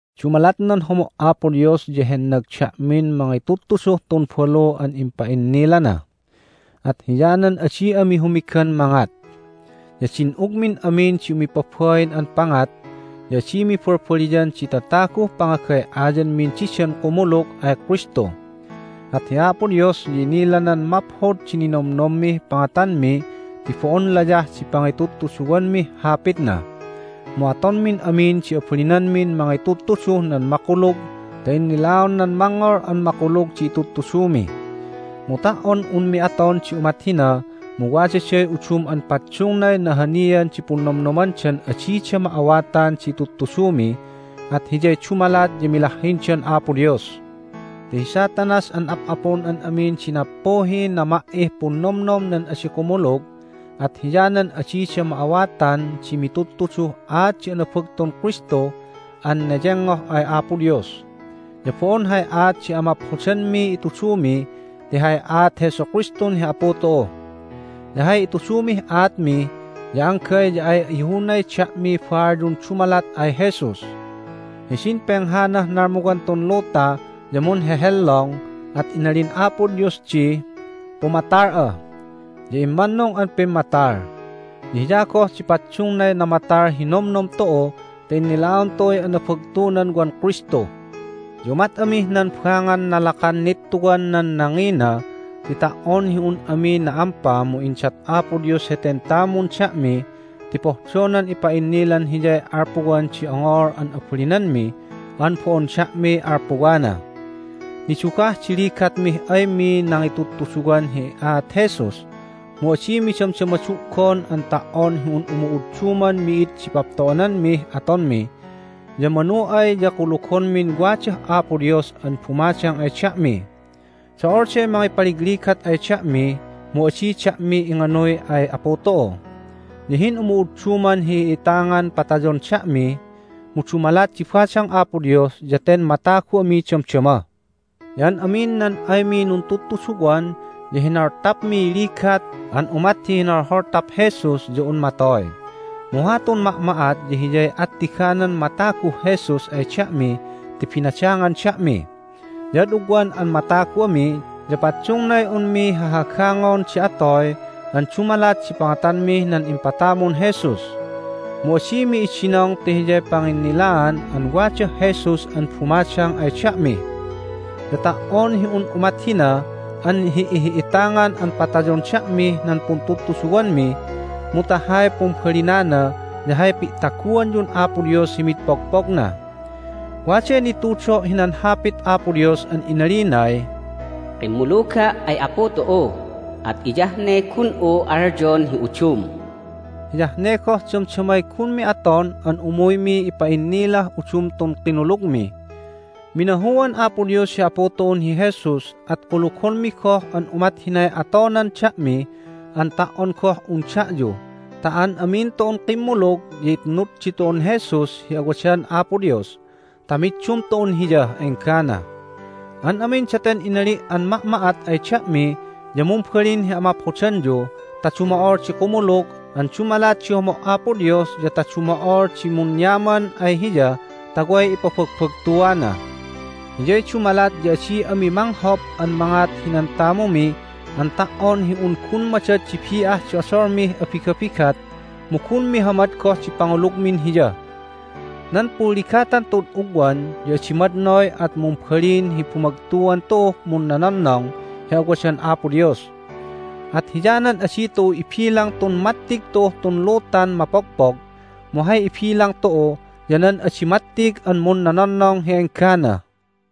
Dumalat nan homo' Apo Dios ya hennag da'min mangitudtuduh tun balu an impa'innilana. At hiyanan adi ami humigan mangat. Ya din'ugmin amin di umipabain an pangat, ya adimi balbaliyan di tataguh pangagay'aymin didan kumulug ay Kristu. At hi Apo Dios ya inilanan maphod di ninomnommih pangatanmi ti bo'on layah di pangitudtuduwanmih Hapitna, mu atonmin amin di abalinanmin mangitudtuduh nan makulug ta innilaon nan mangngol an makulug di itudtudumi. Mu ta"on unmi aton di umat hina mu wadaday udum an paddungnay nahanian di punnomnomdan adida ma'awatan di itudtudumi, at hiyay dumalat ya milahhindan Apo Dios. Ti hi Satanas an ap'apun an amin di nappuhiy nama"ih punnomnom nan adi kumulug, at hiyanan adida ma'awatan di mitudtuduh aat di anabagtun Kristu an neyengngoh ay Apo Dios. Ya bo'on hay aat di amaphodanmiy itudumi ti hay aat Jesu Kristun hi Apu tu'u. Ya hay itudumih aatmi ya anggay ya ay ihunay da'miy baalyun dumalat ay Jesus. Hidin penghanah nalmuwan tun luta ya munhehellong, at inalin Apo Dios di, "Pumatal'a!" ya immannung an pimmatal. Ya Hiya goh di paddungnay namatal hi nomnom tu'u ta innilaon tu'uy anabagtunan wan Kristu. Ya umat amih nan bangan nalakan nittuwan nan nangina ti ta"on hi un ami na'ampa mu indat Apo Dios heten tamun da'mi ti pohdonan ipa'innilan Hiyay alpuwan di ongol an abalinanmi an bo'on da'miy alpuwana. Nidugah di ligatmih aymi nangitudtuduwan hi aat Jesus, mu adimi damdama du'gon an ta"on hi un umu'udduman mi'id di papto'ananmih atonmi, ya manu ay ya kulugonmin wadah Apo Dios an bumadang ay da'mi. Do'olday mangipaligligat ay da'mi, mu adi da'mi inganuy ay Apu tu'u. Ya hin'umu'udduman hi'ihi'itangan patayon da'mi, mu dumalat di badang Apo Dios ya ten matagu ami damdama. Ya an amin nan aymi nuntudtuduwan ya hinoltapmiy ligat an umat hi hinolholtap Jesus ya un matoy, mu hatun ma'ma'at ya hiyay attiganan mataguh Jesus ay da'mi ti binadangan da'mi. Ya ad ugwan an matagu ami ya paddungay unmi hahagangon di atoy an dumalat di pangatanmih nan impatamun Jesus. Mu adimi idinong ti hiyay panginnilaan an wadah Jesus an bumadang ay da'mi. Ya ta"on hi un umat hina an hi'ihi'itangan an patayon da'mih nan puntudtuduwanmi mu ta hay pumbalinana ya hay pi'taguanyun Apo Dios hi mid pogpogna. Waday nitudo' hinan Hapit Apo Dios an inalinay, "Kimmuluga' ay Apu tu'u, at hiyah ne gun'u alyon hi udum." Hiyah ne goh damdamay gunmi aton an umuymi ipa'innilah udum tun kinulugmi. Minahuan Apo Dios hi Apu tu'un hi Jesus, at kulugonmi goh an umat hinay atonan da'mi an ta"on goh un da'yu ta an amin tu'un kimmulug ya itnud ditu'un Jesus hi awadan Apo Dios ta middum tu'un Hiyah enggana. An amin daten inali' an ma'ma'at ay da'mi ya mumbalin hi amaphodanyu ta dumo'ol di kumulug an dumalat di homo' Apo Dios ya ta dumo'ol di munyaman ay Hiya ta way ipabagbagtuana. Hiyay dumalat ya adi ami manghop an mangat hinan tamumi an ta"on hi un gun madad di bi'ah di odolmih abigabigat, mu gun mihamad goh di pangulugmin Hiya. Nan punligatan tu'ud ugwan ya adi madnoy at mumbalin hi bumagtuan tu'uh munnononnong hi awadan Apo Dios. At hiyanan adi tu'u ibilang tun mattig tu'uh tun lutan mapogpog, mu hay ibilang tu'u ya nan adi mattig an munnononnong hi enggana.